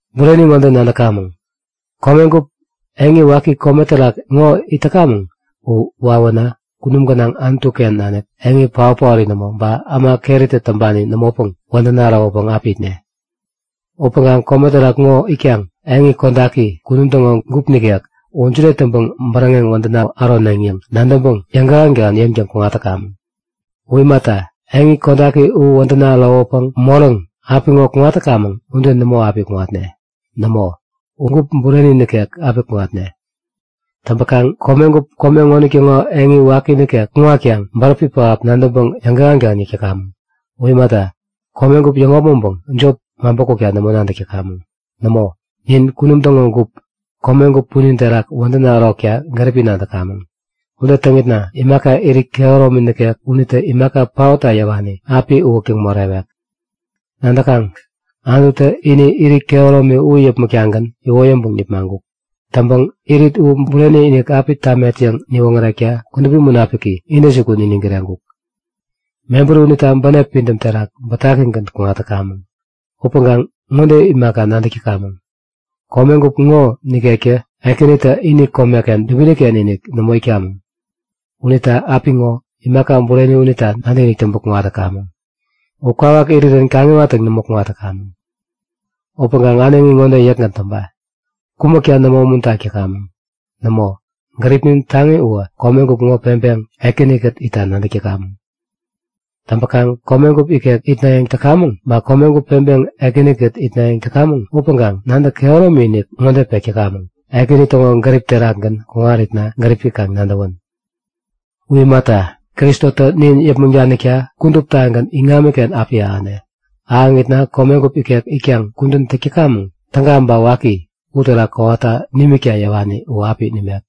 Bureni ŋode nadäkamäŋ; Komegup, eŋi waki kome terak ŋo it täkamäŋ u wawänä kunum gänaŋ Anutu-ken nanik eŋi paot-paori nämo ba äma keritä täŋpani nämopäŋ wädäna ärowäpäŋ api itne. Upäŋkaŋ kome terak ŋo itkaŋ eŋi kodaki, kunum täŋo gup nikek u jide täŋpäŋ bäräŋeŋ wädäna äroneŋ yäŋ nadäŋpäŋ yäŋkähän-kähän yäŋtäŋ kuŋat täkamäŋ. U imata, eŋi kodaki u wädäna ärowäpäŋ moräŋ, apiŋo kuŋat täkamäŋ ude nämo api kuŋatne. Nämo, u gup bureni nikek api kuŋatne. Täŋpäkaŋ komegup, kome ŋonitäŋo eŋi waki nikek kuŋatkaŋ bäräpi pähap nadäŋpäŋ yäŋkähän-kähän yäk täkamäŋ. U imata, komegup yäŋopmäŋpäŋ jop maŋpä-kukta nämo nadäk täkamäŋ. Nämo, nin kunum täŋo gup, komegup punin terak wädäna ärokta gäripi nadäkamäŋ. Ude täŋitna imaka irit kehäromi nikek unitä imaka paotta yäwani api uwäktäŋ morewek. Nadäkaŋ? Anututä ini irit kehäromi u yäpmäk-tagän iwoyäŋpäŋ nipmaŋkuk. Täŋpäŋ irit u bureni-inik api tamet yäŋ niwoŋärekta Kudupi Munapiki intäjukun niniŋ kireŋkuk. Mebäri unita bänep pidäm terak bätakigän kuŋat täkamäŋ. Upäŋkaŋ ŋode imaka nadäk täkamäŋ; Komegup ŋo nikekä, Ekänitä ini komeken dubini-ken-inik nämo itkamäŋ. Unita apiŋo, imaka bureni unita nadäkinik täŋpäŋ kuŋat täkamäŋ. U kwawak irirän kaŋiwattäŋ nämo kuŋat täkamäŋ. Upäŋkaŋ äneŋi ŋode yäkgän täŋpa; Kumäkta nämo umuntak täkamäŋ. Nämo, gäripnin taŋi uwä komegup ŋo peŋpäŋ Ekäni-kät itta nadäk täkamäŋ. Täŋpäkaŋ komegup ikek itnayäŋ täkamäŋ ba komegup peŋpäŋ Ekäni-kät itnayäŋ täkamäŋ upäŋkaŋ nadäk kehäromi-inik ŋode pek täkamäŋ; Ekäni täŋo gärip terakgän kuŋaritna gäripi kaŋ nadäwän. U imata, Kristotä nin yäpmäŋ danikta kuduptagän iŋamiken api ahäne. Ahäŋitna komegup ikek itkaŋ kudän täk täkamäŋ, täga ba waki, uterak kowata nimikta yäwani u api nimek.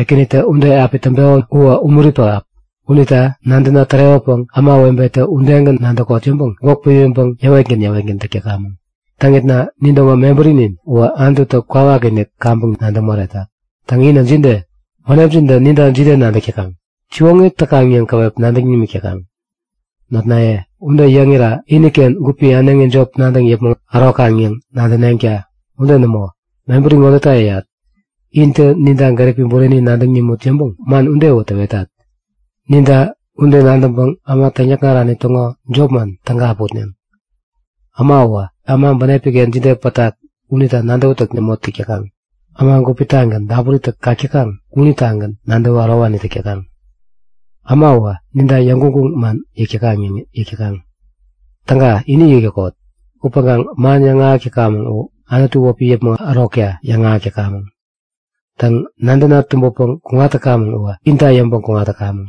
Ekänitä ude api täŋpeko uwä umuri pähap. Unita nadäna tärewäpäŋ ämawebetä udegän nadäkot yäŋpäŋ gwäk pimiŋpäŋ yäwetgän yäwetgän täk täkamäŋ. Täŋitna nin täŋo mebärinin uwä Anututä kwawakinik kaŋpäŋ nadäŋ moretak. Täŋ, inä jide? Bänepjintä ninta jide nadäk täkaŋ? Siwoŋi täkaŋ yäŋ käwep nadäŋ nimik täkaŋ? Notnaye, ude yäŋira iniken gupi äneŋi jop nadäŋ yäpmäŋ ärokaŋ yäŋ nadäneŋta! Ude nämo, mebäri ŋodeta yäyat; Intä ninta gäripi bureni nadäŋ nimut yäŋpäŋ man udewä täwetat. Ninta ude nadäŋpäŋ äma täŋyäkŋarani täŋo jopman täga api utneŋ. Äma uwä äma bänepi-ken jide pätak unita nadäwätäk nämo täk täkaŋ. Äma gupitagän, dapuritä kak täkaŋ unitagän nadäwä ärowani täk täkaŋ. Äma uwä ninta yäŋguŋguŋ man yäk täkaŋ yäŋ yäk täkaŋ. Täga, ini yäk täkot! Upäŋkaŋ man yäŋahäk täkamäŋ u Anutu wäpi yäpmäŋ ärokta yäŋahäk täkamäŋ. Täŋ, nadäna tumbäpäŋ kuŋat täkamäŋ uwä inta yäŋpäŋ kuŋat täkamäŋ.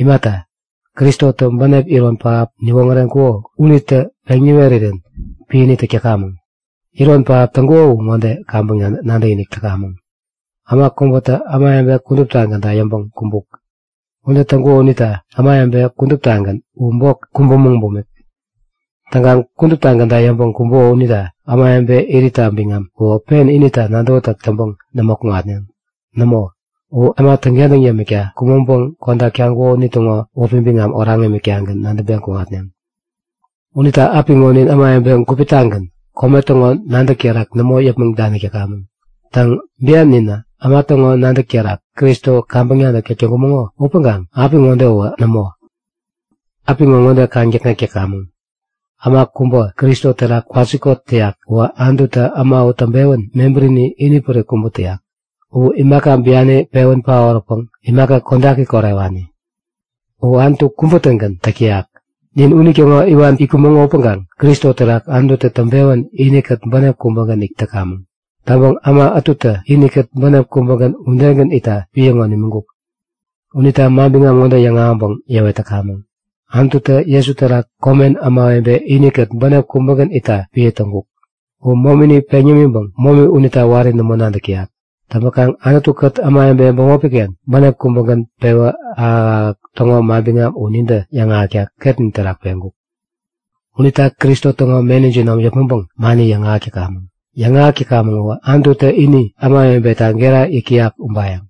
Imata, Kristotä bänep iron pähap niwoŋäreŋkuko unitä peŋ niwerirän piäni täk täkamäŋ. Iron pähap täŋkuko u ŋode kaŋpäŋ nadäkinik täkamäŋ; Äma kubätä ämawebe kuduptagänta yäŋpäŋ kumbuk. Ude täŋkuko unita ämawebe kuduptagän u bok kumbumäŋ bumik. Täŋkaŋ kuduptagänta yäŋpäŋ kumbuko unita ämawebe iritta biŋam uwä pen inita nadäwätäk täŋpäŋ nämo kuŋatneŋ. Nämo, u äma täŋkentäŋ yämikta kumäŋpäŋ kodak taŋkuko unitäŋo wäpi biŋam oraŋ imiktagän nadäŋpeŋ kuŋatneŋ. Unita apiŋo nin ämawebe gupi-tagän, kome täŋo nadäk terak nämo yäpmäŋ danik täkamäŋ. Täŋ, bian ninä äma täŋo nadäk terak Kristo kaŋpäŋ nadäk täk täŋkumäŋo upäŋkaŋ apiŋode uwä nämo! Apiŋo ŋode kaŋdäkŋek täkamäŋ; Äma kubä Kristo terak kwasikot täyak uwä Anututä äma u täŋpewän mebärini inipärik kubä täyak. U imaka biani pewän paoräpäŋ imaka kodaki korewani. U Anutu kubä-tägän täk täyak. Nin unitäŋo iwan itkumäŋo upäŋkaŋ Kristo terak Anututä täŋpewän inikät bänep kubägän it täkamäŋ. Täŋpäŋ äma ätutä inikät bänep kubägän udegän itta piä ŋo nimiŋkuk. Unita manbiŋam ŋode yäŋahäŋpäŋ yäwet täkamäŋ; Anututä Jesu terak komen ämawebe inikät bänep kubägän itta piä täŋkuk. U momini peŋ yämiŋpäŋ momi unita wari nämo nadäk täyak. Täŋpäkaŋ Anutu-kät ämawebe bämopi-ken bänep kubägän pewä ahäk-ahäk täŋo manbiŋam u nintä yäŋahäkta ketnin terak peŋkuk. Unita Kristo täŋo meni jinom yäpmäŋpäŋ mani yäŋahäk täkamäŋ. Yäŋahäk täkamäŋ uwä Anututä ini ämawebeta gera yäyak ubayäŋ.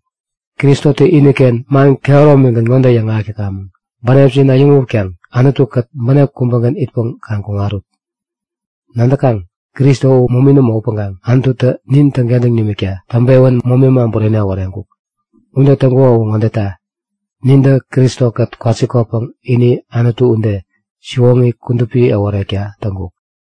Kristotä iniken man kehäromigän ŋode yäŋahäk täkamäŋ; Bänepjin äyäŋutkaŋ Anutu-kät bänep kubägän itpäŋ kaŋ kuŋarut! Nadäkaŋ? Kristo u momi nämo upäŋkaŋ Anututä nin täŋkentäŋ nimikta täŋpewän momi äma bureni äworeŋkuk. Ude täŋkuko u ŋodeta; Nintä Kristo-kät kwasikotpäŋ ini Anutu ude, siwoŋi kudupi äworekta täŋkuk.